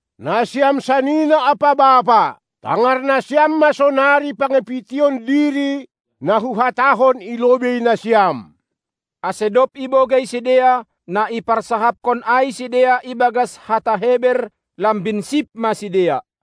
Nasiam sanina ampa bapa, tangar nasiam ma sonari pangapition diri na huhatahon i lobei nasiam! Ase dob ibogei sidea, na iparsahapkon ai sidea ibagas hata Heber, lambin sip ma sidea.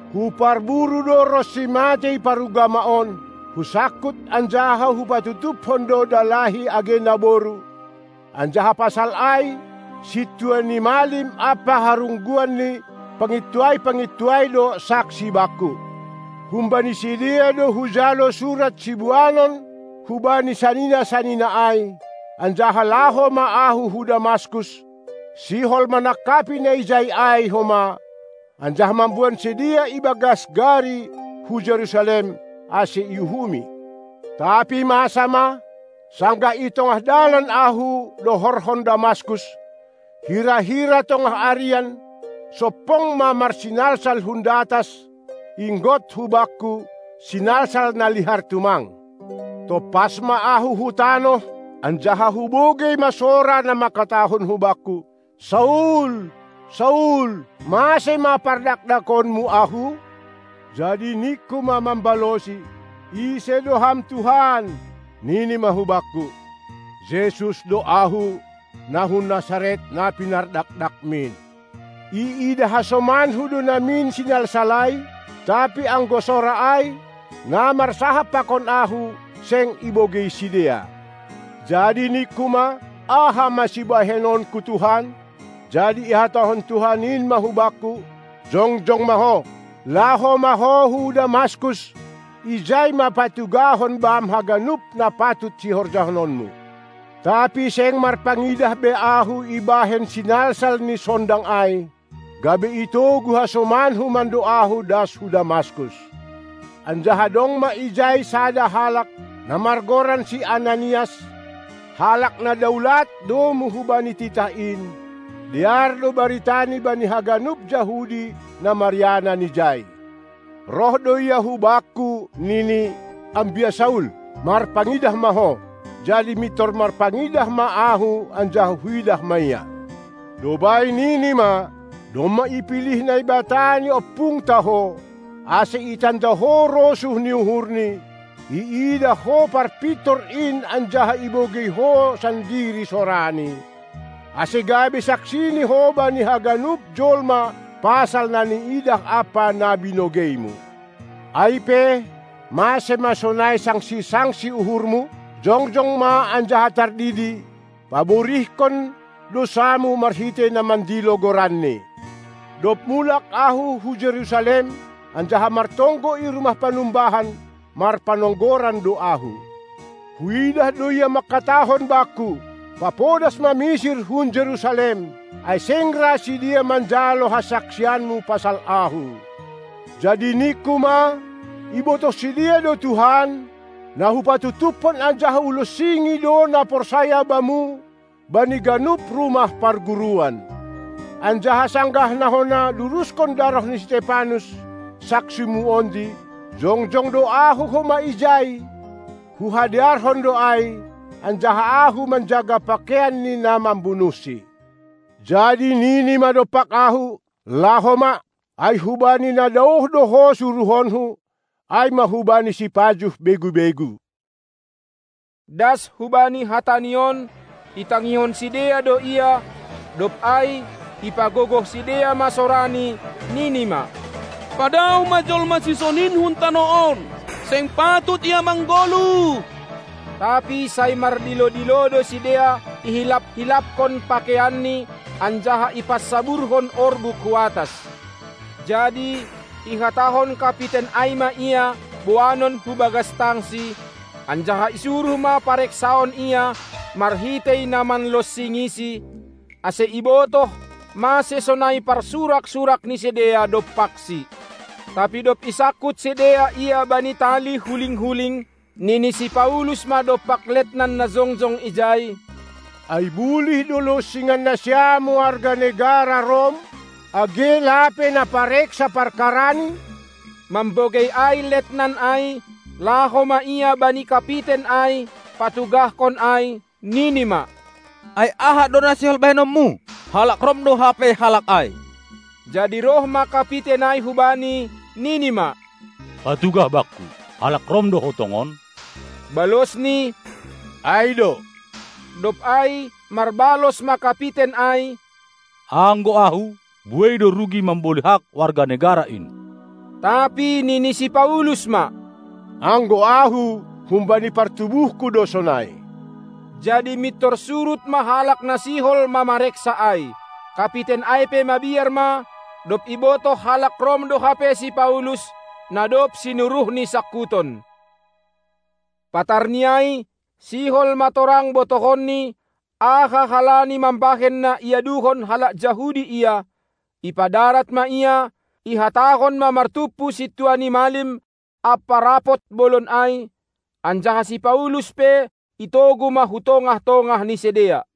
Huparburu do ronsi matei parugama on, husangkut anjaha hu patutupkon do dalahi age naboru, anjaha pasal ai, sintua ni malim ampa harungguan ni pangintuai-pangintuai do saksi bakku. Humbani sidea do hujalo surat siboanon hubani sanina-sanina ai, anjaha laho ma ahu hu Damaskus, sihol manangkapi na ijai ai homa, anjaha mamboan sidea ibagas gari hu Jerusalem, ase iuhumi. Tapi masa ma, sanggah i tongah dalan ahu, dohorhon Damaskus, hira-hira tongah arian, sompong ma marsinalsal hun datas, inggot hubakku, sinalsal na lihar tumang. Tompas ma ahu hu tanoh, anjaha hubogei ma sora na mangkatahon hubakku: Saul! Saul! Mase ma pardakdakonmu Ahu? Jadi ningku ma mambalosi: Ise do Ham Tuhan? Nini ma hubakku: Jesus do Ahu, na hun Nasaret, na pinardakdakmin! Iidah hasomanku do namin sinalsal ai, tapi anggo sora ai, na marsahap pakon ahu, seng ibogei sidea. Jadi ningku ma: Aha ma sibahenonku, Tuhan? Jadi ihatahon Tuhan in ma hubakku: Jongjong ma ho, laho ma ho hu Damaskus, ijai ma patugahon bam haganup na patut sihorjahononmu. Tapi seng marpangidah be ahu ibahen sinalsal ni sondang ai, gabe itogu hasomanku mando ahu das hu Damaskus. Anjaha dong ma ijai sada halak, na margoran si Ananias, halak na daulat domu hubani titah in, dear do baritani bani haganup Jahudi na marianan ijai. Roh do ia hubakku nini: Ambia Saul, marpangidah ma ho! Jadi mintor marpangidah ma ahu anjaha huidah ma ia. Dob ai nini ma: Domma ipilih Naibata ni ompungta ho, ase itanda ho rosuh ni uhurNi, iidah ho Parpintor in anjaha ibogei ho sandiri sorani, ase gabe saksini ho bani haganup jolma pasal na niidah ampa na binogeimu. Ai pe, mase ma sonai sangsi-sangsi uhurmu? Jongjong ma anjaha tardidi, paburihkon dousamu marhitei na mandilo goranNi. Dob mulak ahu hu Jerusalem anjaha martonggo i rumah panumbahan, marpanonggoran do ahu. Huidah do Ia mangkatahon bakku: Papodas ma misir hun Jerusalem, ai seng ra sidea manjalo hasaksianmu pasal Ahu. Jadi ningku ma: Ibotoh sidea do Tuhan, na hupatutupkon anjaha hulonsingi do na porsaya Bamu bani ganup rumah parguruan. Anjaha sanggah na hona duruskon daroh ni si Stepanus, saksi-Mu ondi, jongjong do au homa ijai, huhadearhon do ai, anjaha ahu manjaga pakeian ni na mambunuhsi. Jadi nini ma dompak ahu: Laho ma, ai hubani na daoh do ho suruhonKu, ai ma hubani sipajuh begu-begu. Das hubani hatani on, itangihon sidea do ia; dob ai ipagogoh sidea ma sorani, nini ma: Padaoh ma jolma sisonin hun tanoh on, seng patut ia manggoluh! Tapi sai mardilo-dilo do sidea, ihilap-hilapkon pakeianni anjaha ipansaburhon orbuk hu atas. Jadi ihatahon kapiten ai ma ia boanon hu bagas tangsi, anjaha isuruh ma pareksaon ia marhitei na manlonsingisi, ase ibotoh mase sonai parsurak-surak ni sidea dompaksi. Tapi dob isangkut sidea ia bani tali huling-kuling, nini si Paulus ma dompak letnan na jongjong ijai: Ai bulih do lonsingan nasiam warga negara Rom, age lape na pareksa parkarani? Mambogei ai letnan ai, laho ma ia bani kapiten ai, patugahkon ai, nini ma: Ai aha do na sihol bahenonmu? Halak Rom do hape halak ai. Jadi roh ma kapiten ai hubani, nini ma: Patugah bakku, halak Rom do ho tongon? Balosni: Ai do! Dob ai marbalos ma kapiten ai: Anggo ahu, buei do rugi mamboli hak warga negara in. Tapi nini si Paulus ma: Anggo ahu, humbani partubuhku do sonai. Jadi mintor surut ma halak na sihol mamareksa ai. Kapiten ai pe mabiar ma, dob ibotoh halak Rom do hape si Paulus, na dob sinuruhni sangkuton. Patarni ai sihol ma torang botohonni, aha halani mambahen na iaduhon halak Jahudi ia; ipadarat ma ia, ihatahon ma martumpu sintua ni malim ampa rapot bolon ai, anjaha si Paulus pe itogu ma hu tongah-tongah ni sidea.